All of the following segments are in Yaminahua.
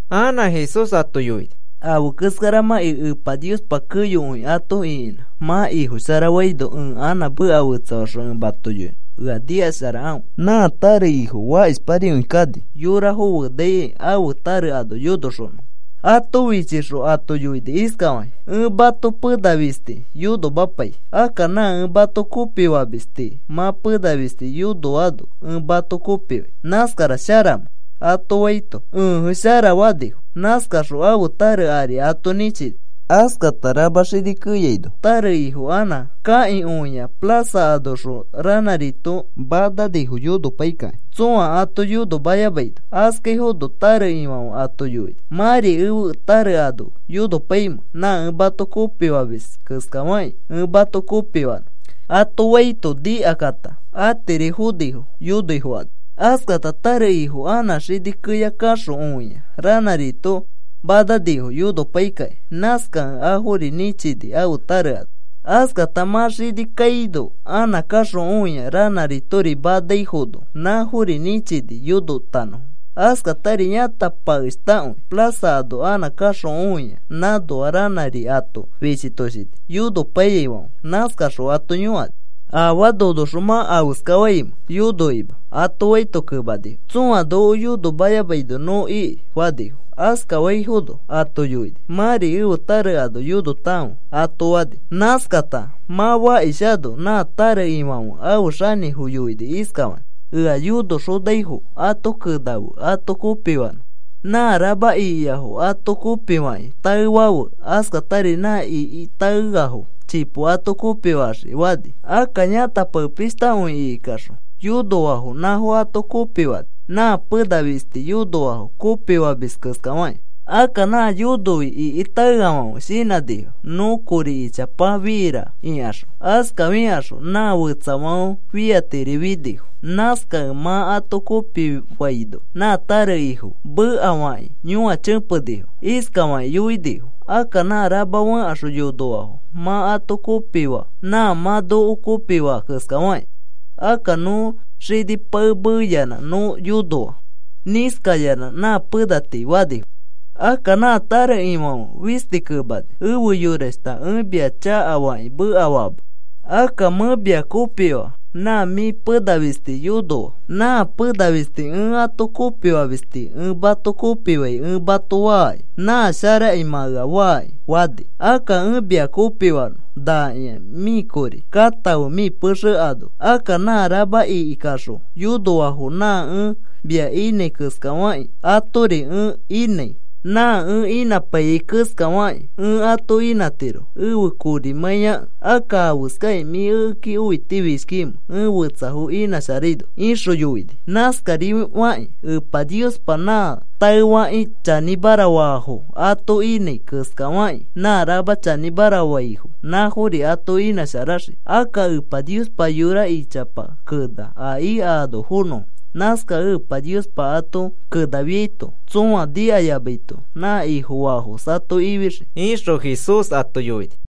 Anã Jesús ato yoini: “Afe keskaramãkĩ Epa Niospa keyokõi ato ĩkinã mã Ifosharafaino, ẽ anã meka fetsafaxõ ẽ mato yoinõ. Ea nikasharakãfe. Nã tare ifo mã fakishparikõi kani yorafo fenaikai ãfe tare ano yonoxonõfo. Ato fichixõ ato yoini iskafakĩ: ‘Ẽ mato pena fisti yonomapai. Akka nã ẽ ato kopifamis tii mã pena fisti yonoano ẽ mato kopifai, ¿nãskara sharamẽ?’ ato faito, ‘Ẽje, shara,’ fanifo. Nãskaxõ ãfe tare ari ato nĩchini. Askata rama xini keyaino tare ifo anã kakĩ õia plaza anoxõ ranãrito manaifono yonopaikakĩ tsõa ato yonomayamaino. Askaifono tare ifãfe ato yoini: ‘¿Mãri ẽfe tare ano yonopaimẽ nã ẽ ato kopifamis keskafakĩ ẽ mato kopifanõ?’ ato faito nikakata atiri fonifo yonoi fokani. Askata tare ifo anã xini keya kaxõ õia ranãrito mananifo yonopaikakĩ. Nãskakẽ afori nĩchini ãfe tare ano. Askata mã xini kaino anã kaxõ õia ranãritori manaifono. Nãfori nĩchini yonotanõfo. Askatari yãtapishtakõi plaza ano anã kaxõ õia nãnoa ranãri ato fichitoshini yonopaiyaifãfe. Nãskaxõ ato yõkani: ‘¿Afaa nonoxõ mã afeskafaimẽ yonokima?’ ato faito kemanifo, ‘Tsõa noko yonomayamaino nõ iki,’ fanifo. Askafaifono ato yoini: ‘Mãri ẽfe tare ano yonotakãfe,’ ato fani. “Nãskata mã fakishano nã tare ifãfe afe xanĩfo yoini iskafakĩ: ‘Ea yonoxonaifo ato kenafe ato kopifanõ. Nã rama ikiafo ato kopifakĩ taefafe. Askata nã iki taeafo chipo ato kopifaxiki,’ fani. Akka yãtapishtakõi ikikaxõ yonoafo nãfo ato kopifani nã pena fisti yonoafo kopifamis keskafakĩ. Akka nã yonoi iki taeafãfe shinãnifo: ‘Nõ kori ichapa fira,’ ikaxõ, askafikaxõ nã fetsafãfe fiaitiri finifo. Nãskakẽ mã ato kopifaino, nã tare ifo mekafakakĩ yõachẽpenifo. Iskafakĩ yoinifo: ‘Akka nã rama fẽkaxõ yonoafo mã ato kopifaa nã mã noko kopifaa keskafakĩ. Akka nõ xini pae meeyanã nõ yonoa nĩskayanã nã pena tii,’ fanifo. Akka nã tare ifãfe fisti kemani: ‘Efe yorashta, ẽ mia chakafakĩ mekafaama. Akka mẽ mia kopifaa nã mĩ pena fisti yonoa. Nã pena fisti ẽ ato kopifamis tii ẽ mato kopifai ẽ mato faaki. Nã sharaki mã ea faaki,’ fani. ‘Akka ẽ mia kopifanõ, nakĩa mĩ kori. Katãfe mĩ pexe ano. Akka nã rama ikikaxõ yonoafo nã ẽ mia inãi keskafakĩ atori ẽ inãi. Nã ẽ inãpaiyai keska fakĩ ẽ ato inãtiro, ẽfe korimãiyakẽ. Akka, ¿afeskai mĩ ekeki õitifishkikimẽ ẽ fetsafo inãsharaino?’ ixõ yoini. Nãskarifakĩ Epa Niospa nã taefakĩ chanĩmara faafo ato inãi keskafakĩ nã rama chanĩmara faifo nãfori ato inãsharaxii. Akka Epa Niospa yora ichapa kena a ika ano fonõfo. Nãskakẽ Epa Niospa ato kenafiaito tsõa nikayamaito nã Ifofaafos ato ifixii,” ixõ Jesús ato yoini.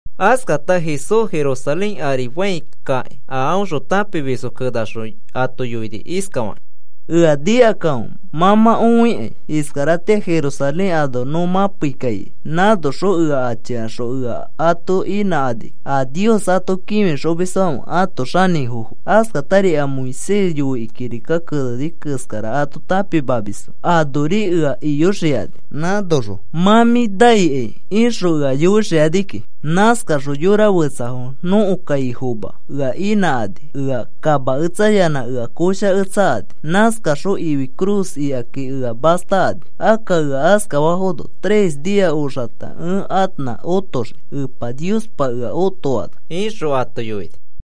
Askata Jesús Jerusalén ari fãi kakĩ a aõxõ tãpimisfo kenaxõ ato yoini iskafakĩ: “Ea nikakãfe. Mã mã õikai iskaratĩa Jerusalén ano nõ mãpei kaikai. Nãnoxõ ea achikaxõ ea ato inãkani, a Nios ato kĩfixomisfãfe ãto xanĩfofo, askatari a Moisés yoikĩ kirika keneni keskara ato tãpimamisfo anori ea iyoxikani. Nãnoxõ, ‘Mã mĩ naikai,’ ixõ ea yoixikani kiki. Nãskakaxõ yora fetsafo nõko kaifoma ea inãkani ea kamaketsayanã ea koshaketsakani. Nãskakaxõ ifi cruz ikaki ea mastakani. Akka ea askafafono tres nia oxata ẽ anã otoxii Epa Niospa ea otofaano,” ixõ ato yoini.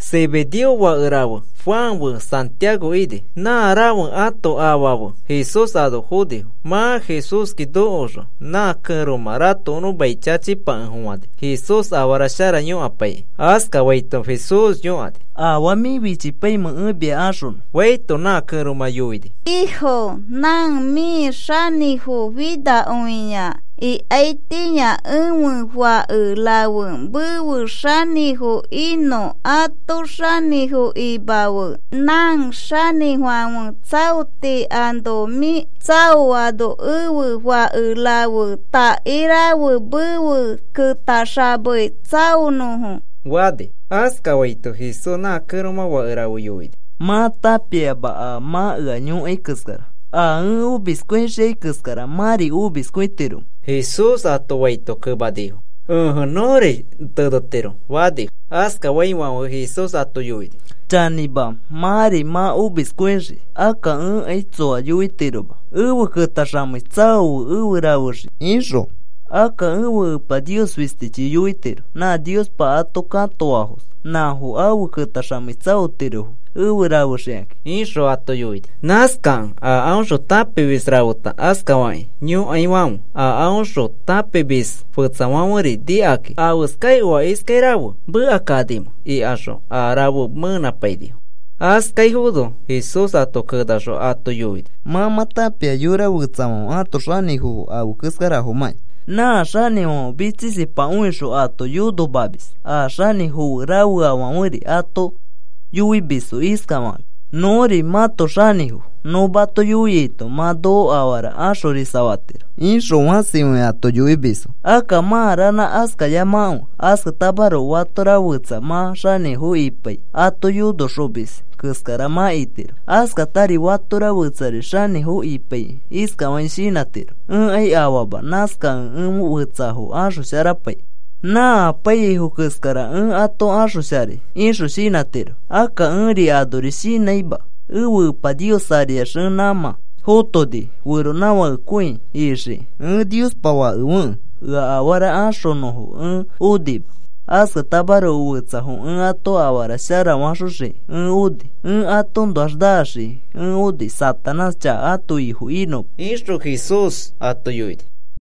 Zebedeo fake rafe Juan fe Santiago ini. Nã rafe ãto afa fe Jesús ano fonifo. Mã Jesúski nokoxõ nã kẽromã ratokonõ mai chachipakefofãni Jesús afara shara yõkapaikĩ. Askafaito Jesús yõkani: “¿Afaa mĩ fichipaimẽ ẽ mia axonõ?” faito, nã kẽromã yoini: “Ifo, nã mĩ xanĩfo finakõia ikaitĩa ẽfe fake raferi mefe xanĩfo inõfo ato xanĩfo imafe. Nã xanĩfãfe tsaoti ano mĩ tsaoano ẽfe fake rafe takairafe mefe ketaxamei tsaonõfo,” fani. Askafaito Jesús nã kẽromã fake rafe yoini: “Mã tãpiama a mã ea yõkai keskara. ¿A ẽ omiskõixiai keskara mãri omiskõitiromẽ?” Jesús ato faito kemanifo: “Ẽje, nõri tenetiro,” fanifo. Askafaifãfe Jesús ato yoini: “Chanĩma, mãri mã omiskõixii. Akka ẽkai tsoa yoitiroma, ‘Efe ketaxamei tsaofe efe rafexii’ ixõ. Akka ẽfe Epa Nios fistichi yoitiro. Nã Niospa ato katoafos nãfo afe ketaxamei tsaotirofo efe rafexikakĩ,” ixõ ato yoini. Nãskakẽ a aõxõ tãpimis rafeta askafakĩ yõkaifãfe a aõxõ tãpimisfo fetsafãferi nikakakĩ, “¿Afeskai oa iskai rafe mekakanimẽ?” ikaxõ a rafe meepainifo. Askaifono Jesús ato kenaxõ ato yoini: “Mã mã tãpia yora fetsafãfe ãto xanĩfofo afe keskarafomãkĩ. Nã xanĩfãfe mitsisipakõixõ ato yonomamis. A xanĩfo fe rafeafãferi ato yoimisfo iskafakakĩ: ‘Nõri mãto xanĩfo. Nõ mato yoiaito mã noko afara axorisafatiro,’ ixõ fãsikõi ato yoimisfo. Akka mã ranã askayamakãfe. Askatamaroko fatora fetsa mã xanĩfo ipai ato yonoxomis keskara mã itiro. Askatari fatora fetsari xanĩfo ipaikĩ iskafakĩ shinãtiro: ‘Ẽkai afaama. Nãskakẽ ẽ fetsafo axosharapai. Nã apaiyaifo keskara ẽ ato axosharai,’ ixõ shinãtiro. Akka ẽri anori shinãima, ẽfe Epa Nios ariax ẽ nãmã fotoni feronãfakekõi ixiki, ẽ Niospa Fakefekẽ ea afara axonõfo ẽ onima. Askatamaroko fetsafo ẽ ato afara sharafaxoxiki ẽ oni. Ẽ atoõnoax naxiki ẽ oni Satanás chaka ãto ifo inõma,” ixõ Jesús ato yoini.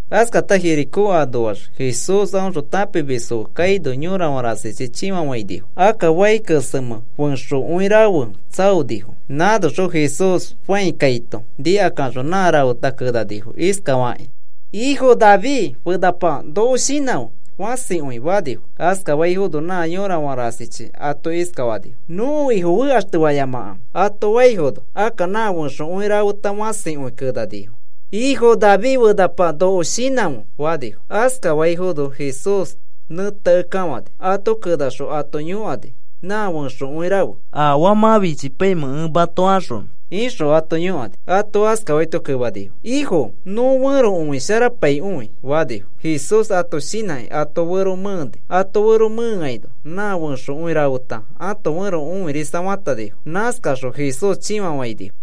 Askata Jericó anoax Jesús aõxõ tãpimisfo fe kaino yorafã rasichi chĩfafainifo. Akka fai kesemẽ fẽxokõi rafe tsaonifo. Nãnoxõ Jesús fãi kaito nikakaxõ nã rafeta kenanifo iskafakakĩ: “Ifo, David fenapa, noko shinãfe,” fãsikõi fanifo. Askafaifono nã yorafã rasichi ato iskafanifo: “Nõko Ifo fekaxtefayamakãfe,” ato faifono, akka nã fẽxokõi rafe fãsikõi kenanifo: “Ifo, David fenapa, ¡noko shinãfe!” fanifo. Askafaifono Jesús nẽteakekafani. Ato kenaxõ ato yõkani nã fẽxokõi rafe: “¿Afaa mã fichipaimẽ ẽ mato axonõ?” ixõ ato yõkani. Ato askafaito kemanifo: “Ifo, nõ fẽro õisharapaikõi,” fanifo. Jesús ato shinãkĩ ãto fero mẽeni. Ãto fero mẽeaino nã fẽxokõi rafeta ãto fẽro õirisafatanifo. Nãskakaxõ Jesús chĩfafainifo.